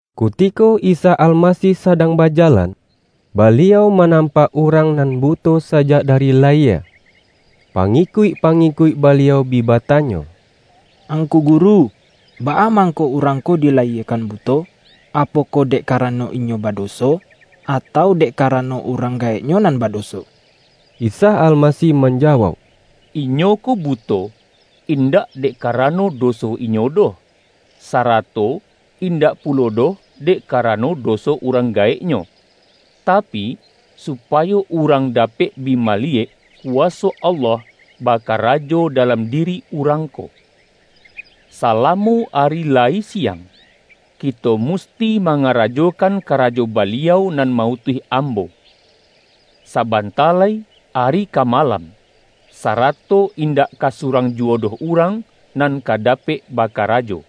Kutiko Isa Almasih sadang bajalan, Baliau manampak urang, nan buto sajak dari layie. Pangikuik-pa-ngikuik Baliau bi batanyo,”Angku Gu-ru, baa mangko urang ko dilayiekan buto? Apokoh dek karano inyo bado-so, atau dek karano urang gaeknyo nan badoso?” Isa Almasih manjawauk,”Inyo ko buto, indak dek karano doso inyo doh, sarato indak pulo doh dek ka-rano doso urang gaeknyo, tapi, su-payo urang dapek bi maliyek, kuwa-so Allah bakarajo dalam diri urang ko. Salamo ari layi siang, kito mus-ti mangarajokan karajo Baliau nan ma-utuih Ambo. Sabanta lai ari ka malam, sarato indak ka surang juwo doh urang nan ka dapek bakarajo.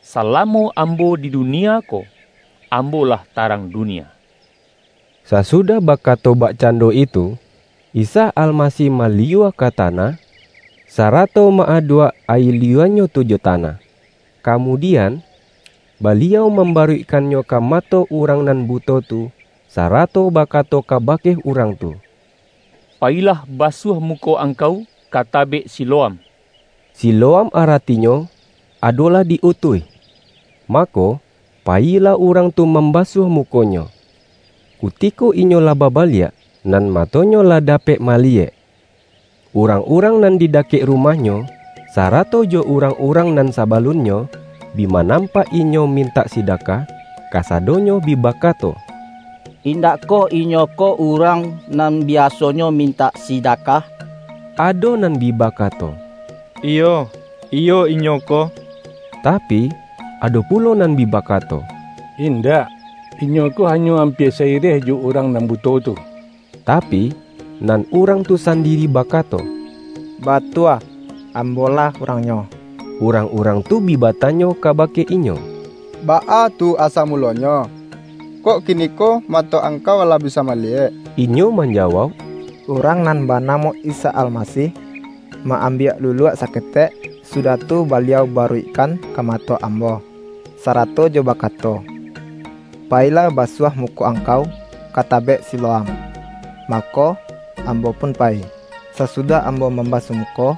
Salamo Ambo di dunia ko, Ambo-lah tarang dunia.” Sasudah bakato bakcando itu, Isa Almasih maliyua ka tanah, sarato ma-aduak ayie liyua-Nyo tu jo tanah. Ka-mudian, Baliau mambaruikkannyo ka mato urang nan buto tu, sarato baka-to kabake urang tu,”Payilah basuah muko angkau ka Tabek Siloam.” (Si-loam aratinyo adolah ’Di-utuih'.) Ma-ko, payilah urang tu mambasuah mu-konyo. Kutiko inyo lah babaliak, nan matonyo lah dapek maliyek. Urang-urang nan di dakek rumah-nyo, sarato jo urang-urang nan saba-lunnyo bi manampak inyo mintak si-dakah, kasadonyo bi bakato,”Indak koh inyo ko urang nan biasonyo min-tak sidakah?” Ado nan bi bakato,”Iyo, iyo inyo ko.” Tapi, ado pulo nan bi bakato,”In-dak, inyo ko hanyo ampia sa-ireh jo urang nan buto tu.” Tapi, nan urang tu sandiri bakato,”Batua, ambolah urangnyo.” Urang-urang tu bi batanyo kabake inyo,”Baa tu asa mulonyo, kok kiniko mato angkau lah bisa maliyek?” Inyo manjawauk,”Urang nan ba-namo Isa Almasih, ma-ambiak luluak saketek, sudah tu Baliau baruikkan ka mato ambo, sarato jo bakato, ’Payilah basuah muko angkau ka Tabek Silo-am.’ Mako, ambo pun payi. Sasudah ambo mambasuah muko,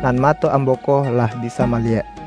nan mato ambo ko lah bisa maliyek.”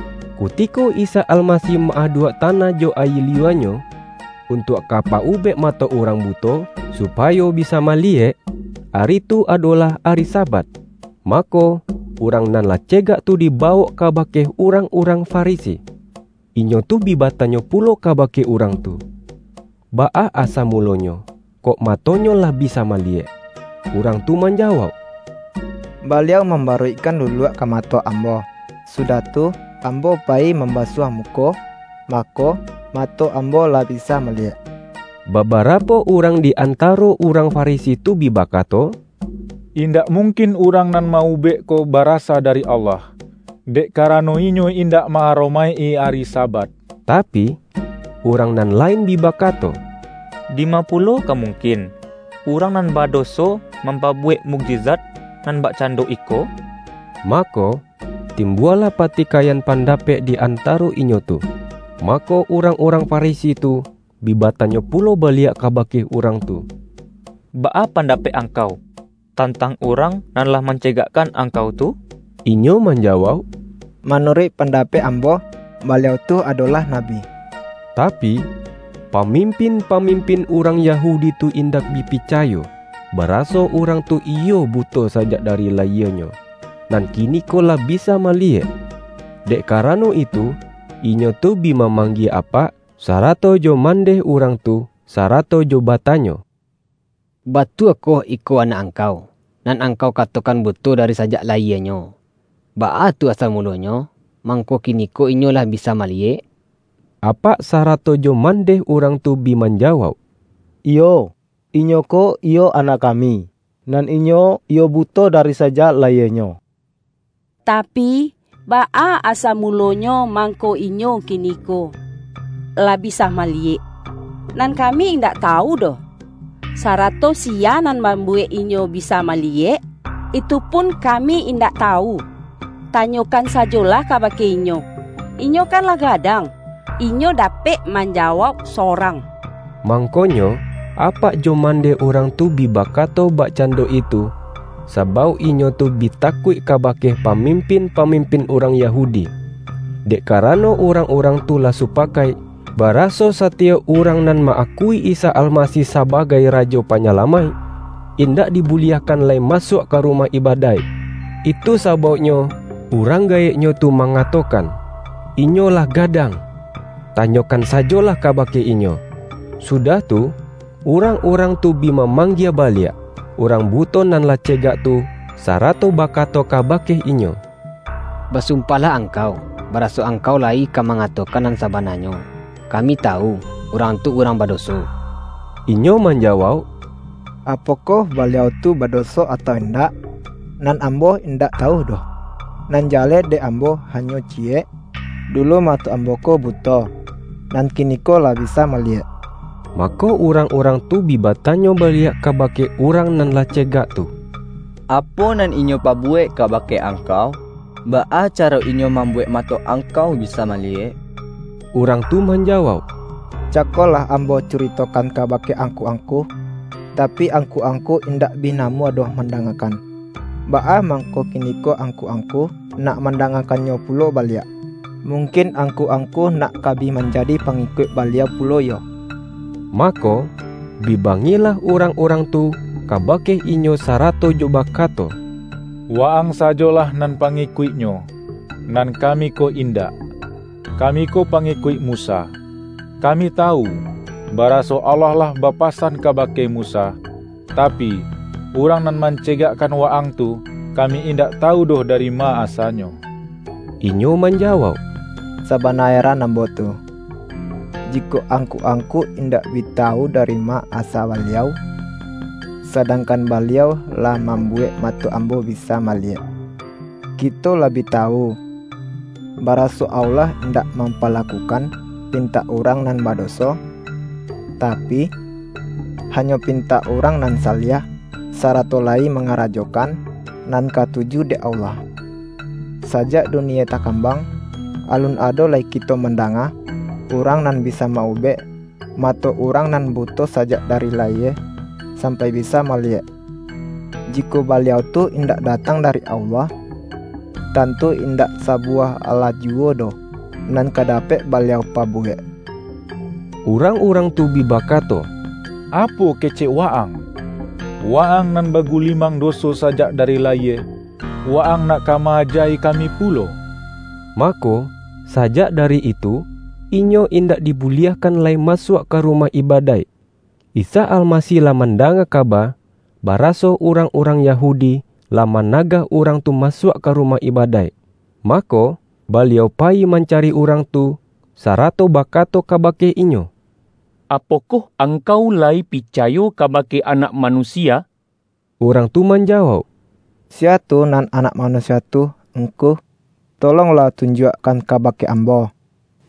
Kutiko Isa Almasih ma-aduak tanah jo ayie liyua-Nyo, untuak ka pa-ubek mato urang buto, supayo bisa maliyek, ari tu, adolah ari Sabat. Mako, urang nan lah cegak tu diba-wok kabake urang-urang Farisi. Inyo tu bi batanyo pulo kabake urang tu, baa asa mulonyo, kok matonyo lah bisa maliyek. Urang tu manjawauk,”Baliau mambaruikkan luluak ka ma-to ambo, sudah tu, ambo payi mam-basuah muko, mako, mato ambo lah bisa maliyek.” Babarapo urang di antaro urang Farisi tu bi bakato,”Indak mungkin Urang nan ma-ubek ko barasa dari Allah, dek karano Inyo indak ma-aro-maik-i ari Sabat.” Tapi, urang nan lain bi bakato,”Di-ma pulo ka mungkin, urang nan bado-so mampabuwek mukjizat nan bakcan-do iko?” Mako, timbualah patikaiyan pandapek di antaro inyo tu. Mako, urang-urang Farisi tu, bi batanyo pulo baliak kabake urang tu,”Baa pandapek angkau, tantang Urang nan lah mancegakkan angkau tu?” Inyo manjawauk,”Manuruik panda-pek ambo, Baliau tu adolah Nabi.” Tapi, pamimpin-pamimpin urang Yahudi tu indak bi picayo, baraso, urang tu iyo buto sajak dari layienyo, nan kiniko lah bisa maliyek. Dek ka-rano itu, inyo tu bi mamanggie apak sarato jo mandeh urang tu, sarato jo batanyo,”Batuakoh iko anak angkau, nan angkau katokan buto dari sajak la-yienyo? Baa tu asa mulonyo, mangko kiniko inyo lah bisa maliyek?” Apak sarato jo mandeh urang tu bi manjawauk,”Iyo, inyo ko iyo anak kami, nan inyo iyo buto dari sajak la-yienyo. Tapi, baa asa mulonyo mang-ko inyo kiniko lah bisa maliyek, nan kami indak tawu doh. Sarato siya nan mambuwek inyo bisa maliyek, itu pun kami indak tawu. Tanyokan sajolah ka-bake inyo, inyo kan lah gadang, inyo dapek manjawauk sorang.” Mang-konyo apak jo mandeh urang tu bi ba-kato bakcando itu, sabauk inyo tu bi takuik kabake pamimpin-pamimpin urang Yahudi. Dek karano urang-urang tu lah supakaik, baraso satiyok urang nan ma-akui Isa Almasih sabagai Rajo Panyalamaik, indak dibuliahkan lai masuak ka rumah ibadaik. Itu sa-bauknyo urang gaeknyo tu mangato-kan,”Inyo lah gadang, tanyokan sa-jolah kabake inyo.” Sudah tu, urang-urang tu bi ma-manggie baliak, urang buto nan lah ce-gak tu, sarato bakato kabake inyo,”Ba-sumpahlah angkau, baraso angkau layi ka mangatokan nan sabananyo. Kami tawu, Urang tu urang badoso.” Inyo manjawauk,”Apokoh Baliau tu badoso atau indak, nan ambo indak tawu doh. Nan jaleh dek ambo hanyo ciyek, dulu mato ambo ko buto, nan kiniko lah bisa maliyek.” Mako urang-urang tu bi batanyo baliak kabake urang nan lah cegak tu,”Apo nan Inyo pabuwek kabake ang-kau? Baa caro Inyo mambuwek mato angkau bisa maliyek?” Urang tu manjawauk,”Cako lah ambo curitokan kabake angku-angku, tapi angku-angku indak bi namuah doh mandangakan. Baa mangko ki-niko angku-angku nak mandangakan-nyo pulo baliak? Mungkin angku-ang-ku nak ka bi manjadi pangikuik Baliau pulo yo?” Mako, bi bangihlah urang-urang tu kabake inyo, sarato jo bakato,”Wa-ang sajolah nan pangikuik-Nyo, nan kami ko indak! Kami ko pangikuik Mu-sa. Kami tawu, baraso Allah lah ba-pasan kabake Musa. Tapi, Urang nan mancegakkan wa-ang tu, kami indak tawu doh dari ma asa-Nyo.” Inyo manjawauk,”Sabana eran ambo tu, jikok angku-angku indak bi tawu dari ma asa Baliau, sadangkan Baliau lah mambuwek mato ambo bi-sa maliyek. Kito lah bi tawu, bara-so Allah indak mampalakukan pintak urang nan badoso, tapi, hanyo pintak urang nan saliah, sarato layi manga-rajokan nan katuju dek Allah. Sajak dunie takambang, alun ado lai kito mandanga, urang nan bisa ma-ubek, mato urang nan buto sajak dari layie, sampai bisa maliyek. Jikok Baliau tu indak datang dari Allah, tantu in-dak sabuwah alah juwo doh nan ka dapek Baliau pabuwek.” Urang-urang tu bi bakato,”Apo kecek wa-ang? Wa-ang nan bagulimang doso sa-jak dari layie, wa-ang nak ka ma-aja-i kami pulo?” Mako, sajak dari itu, inyo indak di-buliahkan lai masuak ka rumah ibadaik. Isa Almasih lah mandanga kaba, ba-raso urang-urang Yahudi, lah managah urang tu masuak ka rumah ibadaik. Ma-ko, Baliau payi mancari urang tu, sarato bakato kabake inyo,”Apokoh angkau layi picayo kabake Anak Manusia?” Urang tu manjawauk,”Siya tu nan Anak Manusia tu, Ngku? Tolonglah tun-juakkan kabake ambo,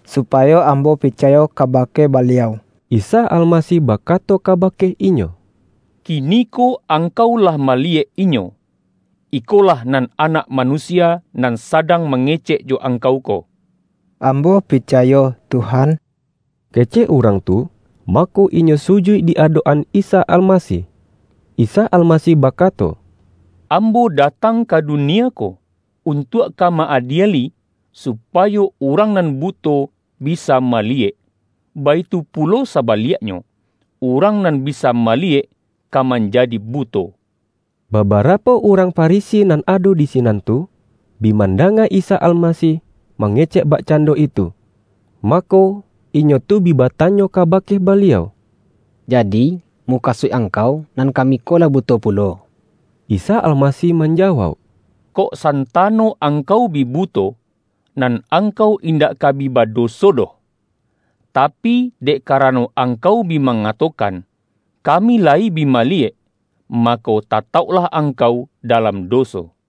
supayo ambo picayo kabake Baliau.” Isa Almasih bakato kabake inyo,”Kiniko angkau lah maliyek Inyo, iko-lah nan Anak Manusia, nan sadang mangecek jo angkau ko.” ”Ambo picayo, Tuhan” kecek urang tu, mako, inyo sujuik di adok-an Isa Almasih. Isa Almasih bakato,”Ambo da-tang ka dunie ko untuak ka ma-adieli, supayo urang nan buto bisa maliyek, baitu pulo sabaliaknyo, urang nan bi-sa maliyek, ka manjadi buto.” Babarapo urang Farisi nan ado di si-nan tu, bi mandanga Isa Almasih mange-cek bakcando itu, mako, inyo tu bi batanyo kabake Baliau,”Jadi, mukasuik Angkau, nan kami ko lah buto pulo?” Isa Almasih manjawauk,”Kok santa-no angkau bi buto, nan angkau indak ka bi badoso doh. Tapi, dek karano angkau bi mangatokan, ’Kami layi bi maliyek.’ mako, tatauklah angkau dalam doso.” YAHYA